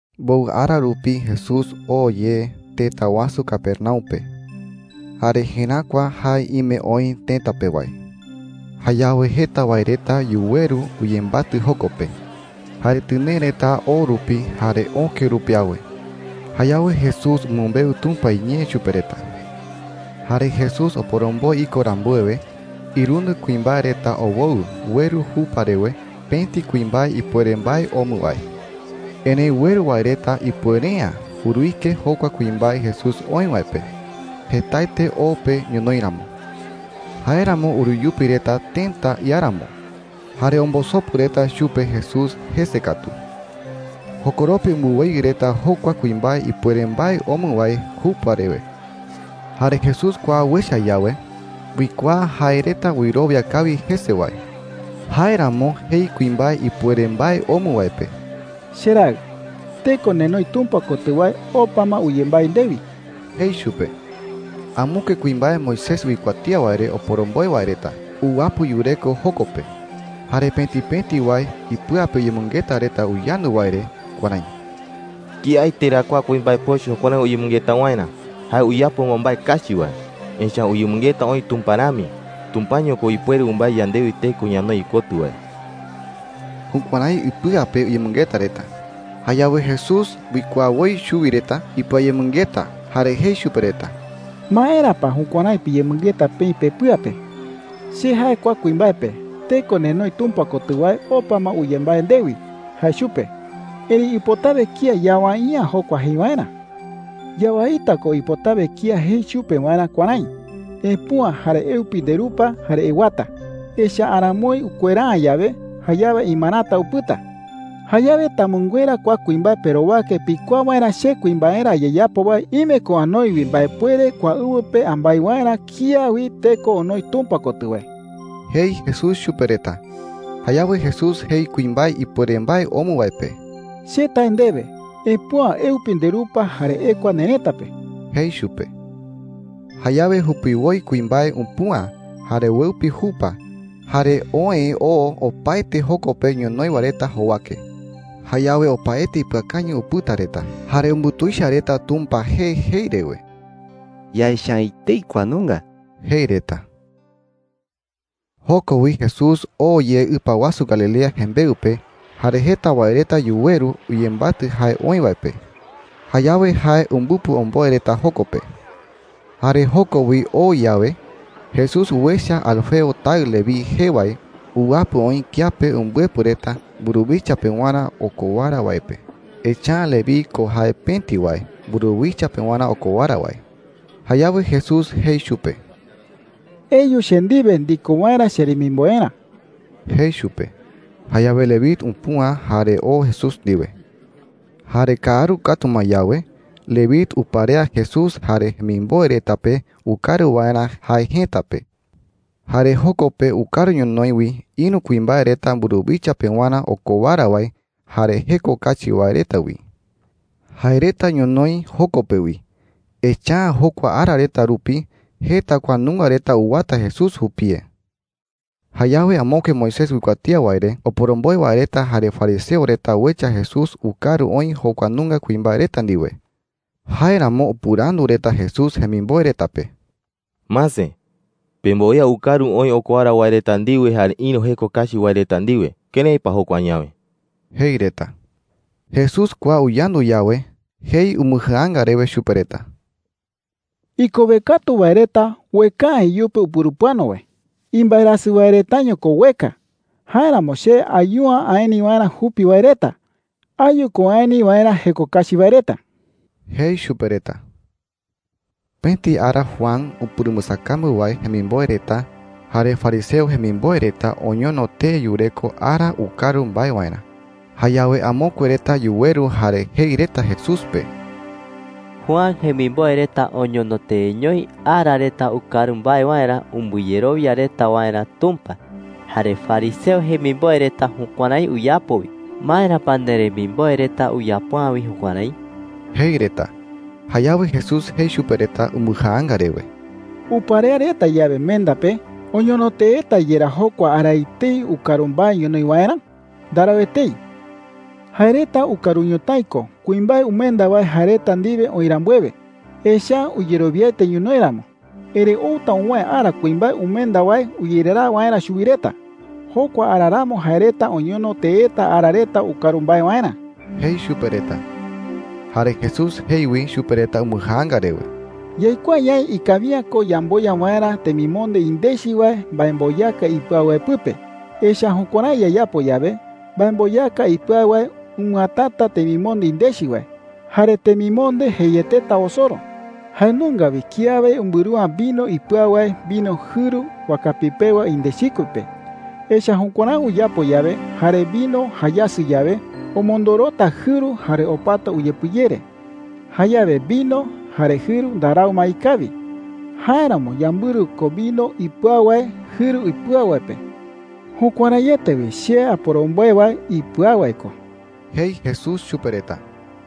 Mbowɨ ara rupi Jesús oo ye tëta wasu Capernaum pe, jare jeräkua jae ime oï tëta pe wae. Jayawe jeta wae reta yuweru uyembatɨ joko pe, jare tɨnee reta o rupi jare öke rupi awe. Jayawe Jesús umɨmbeu Tumpa iñee chupe reta. Jare Jesús oporomboe iko rambuewe, irundɨ kuimbae reta owoɨ ueru jupa rewe pëti kuimbae ipuere mbae omɨ wae. Erëi ueru wae reta ipuere’ä uruike jokua kuimbae Jesús oï wae pe, jetaete o pe ñonoï ramo. Jáeramo uruyupi reta tëta iáramo, jare ombosopu reta chupe Jesús jese katu. Jokoropi umbɨweyɨ reta jokua kuimbae ipuere mbae omɨ wae jupa rewe. Jare Jesús kua uecha yawe, uikuaa jae reta wɨrowia kawi jese wae. Jáeramo jei kuimbae ipuere mbae omɨ wae pe: “Cheraɨ, teko nenoi Tumpa kotɨ wae opa ma uyembái ndewi,” jei chupe. Amokue kuimbae Moisés uikuatía wae re oporomboe wae reta uwapɨ yureko joko pe. Jare pëti pëti wae ipɨa pe uyemɨngeta reta uyandu wae re kuärái: “¿Kiaete ra kua kuimbae pochɨ jukuärái uyemɨngeta waerä? Jae uyapo ma mbae kachi wae, echa’ä uyemɨngeta oï Tumpa rami. Tumpaño ko ipuere umbái yandewi teko ñanoi ikotɨ wae.” Jukuärái ipɨa pe uyemɨngeta reta. Jayawe Jesús uikuaa woi chuwi reta ipɨayemɨngeta, jare jei chupe reta: “¿Maera pa jukuärái piyemɨngeta peï pepɨa pe?” jei. “Che jae kua kuimbae pe, ‘Teko nenoi Tumpa kotɨ wae opa ma uyembái ndewi,’ jae chupe. Erëi ipotawe kía yawai’ä jokua jei waerä,” jei. “Yawaita ko ipotawe kía jei chupe waerä kuärái: ‘Epüa, jare eupi nderupa, jare ewata.’ Echa’ä aramoi ukuera’ä yawe, jayawe imarata upɨta,” jei. “Jayawe tamɨnguera kua kuimbae perowake pikuaa waerä che kuimbaerä ayeyapo wae ime ko anoi wi mbaepuere kua ɨwɨ pe ambái waerä kía wi teko onoi Tumpa kotɨ wae,” jei Jesús chupe reta. Jayawe Jesús jei kuimbae ipuere mbae omɨ wae pe: “Che tae ndewe, epüa. Eupi nderupa, jare ekua nerëta pe,” jei chupe. Jayawe jupiwoi kuimbae upüa, jare ueupi jupa, jare oë oo opaete joko pe ñonoï wae reta jowake. Jayawe opaete ipɨakañɨ upɨta reta, jare umbutuicha reta Tumpa jee jei rewe: “Yaecha’ä etei kua nunga,” jei reta. Joko wi Jesús oo ye ɨpa wasu Galilea jembeɨ pe. Jare jeta wae reta yuweru uyembatɨ jae oï wae pe. Jayawe jae umbɨpɨ omboe reta joko pe. Jare joko wi oo yawe, Jesús uecha Alfeo taɨ Leví jee wae uwapɨ oï kiape umbɨepɨ reta mburuwicha pewarä okowara wae pe. Echa’ä Leví ko jae pëti wae mburuwicha pewarä okowara wae. Jayawe Jesús jei chupe: “Eyu che ndiwe ndiko waerä cheremimboerä,” jei chupe. Jayawe Leví upüa jare oo Jesús ndiwe. Jare kaaru katu ma yawe, Leví uparea Jesús jare jemimboe reta pe ukaru waerä jae jëta pe. Jare joko pe ukaru ñonoï wi ïru kuimbae reta mburuwicha pewarä okowara wae jare jeko kachi wae reta wi. Jae reta ñonoï joko pe wi, echa’ä jokua ara reta rupi jeta kua nunga reta uwata Jesús jupie. Jayawe amokue Moisés uikuatía wae re oporomboe wae reta jare fariseo reta uecha Jesús ukaru oï jokua nunga kuimbae reta ndiwe. Jáeramo upɨrandu reta Jesús jemimboe reta pe: “Mase, pemboea ukaru oï okowara wae reta ndiwe jare ïru jeko kachi wae reta ndiwe. ¿Kërái pa jokua añawe?” jei reta. Jesús kua uyandu yawe, jei umbɨjaanga rewe chupe reta: “Ikowe katu wae reta ueka’ä iyupe upurupɨano wae,” jei. “Imbaerasɨ wae retaño ko ueka. Jáeramo che ayu’ä aeni waerä jupi wae reta. Ayu ko aeni waerä jeko kachi wae reta,” jei chupe reta. Pëti ara Juan upurumbɨsakambu wae jemimboe reta jare fariseo jemimboe reta oñono tee yureko ara ukaru mbae waerä. Jayawe amokue reta yuweru jare jei reta Jesús pe: “Juan jemimboe reta oñono teeñoi ara reta ukaru mbae waerä umbɨyerowia reta waerä Tumpa. Jare fariseo jemimboe reta jukuärái uyapo wi. ¿Maera pa nderemimboe reta uyapo’ä wi jukuärái?” jei reta. Jayawe Jesús jei chupe reta umbɨjaanga rewe: “Uparea reta yawe menda pe, ¿oñono teeta yerá jokua ara etei ukaru mbae ñonoï waerä? Ndarau etei,” jei chupe reta. “Jae reta ukaru ñotái ko kuimbae umenda wae jae reta ndiwe oï rambuewe, echa’ä uyerowiaete ñonoï ramo,” jei. “Erëi outa uwäe ara kuimbae umenda wae uyereraa waerä chuwi reta. Jokua ara ramo jae reta oñono teeta ara reta ukaru mbae waerä,” jei chupe reta. Jare Jesús jei wi chupe reta umbɨjaanga rewe: “Yaikuaa ñaï ikawi’ä ko yamboya waerä temimonde indechi wae mbaemboyaka ipɨau wae pɨpe. Echa’ä jukuärái yayapo yawe, mbaemboyaka ipɨau wae umɨatata temimonde indechi wae, jare temimonde jeieteta osoro,” jei chupe reta. “Jae nunga wi kiawe umbɨru’ä vino ipɨau wae vino jɨru wakapi pewa indechikue pe. Echa’ä jukuärái uyapo yawe jare vino jayasɨ yawe, omondorota jɨru jare opata uyepɨyere. Jayawe vino jare jɨru ndarau ma ikawi. Jáeramo yambɨru ko vino ipɨau wae jɨru ipɨau wae pe,” jei. “Jukuäraiete wi che aporomboe wae ipɨau wae ko,” jei Jesús chupe reta.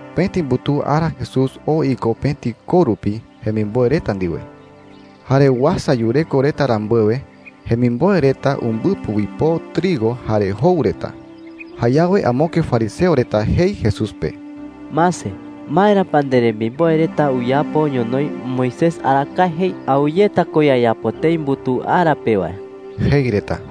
Pëti mbutuu ara Jesús oo iko pëti koo rupi jemimboe reta ndiwe. Jare uasa yureko reta rambuewe, jemimboe reta umbɨpɨ uipoo trigo jare jou reta. Jayawe amokue fariseo reta jei Jesús pe: “Mase, ¿maera pa nderemimboe reta uyapo ñonoï Moisés arakae jei awɨyeta ko yayapo tëi mbutuu ara pe wae?” jei reta.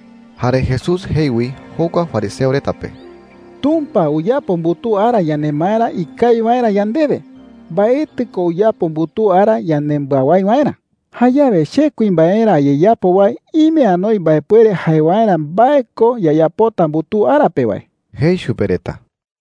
Jare Jesús jei wi jokua fariseo reta pe: “Tumpa uyapo mbutuu ara yanemaerä ikawi waerä yandewe. Mbaetɨ ko uyapo mbutuu ara yanembɨawái waerä,” jei. “Jayawe che kuimbaerä ayeyapo wae ime anoi mbaepuere jae waerä mbae ko yayapota mbutuu ara pe wae,” jei chupe reta.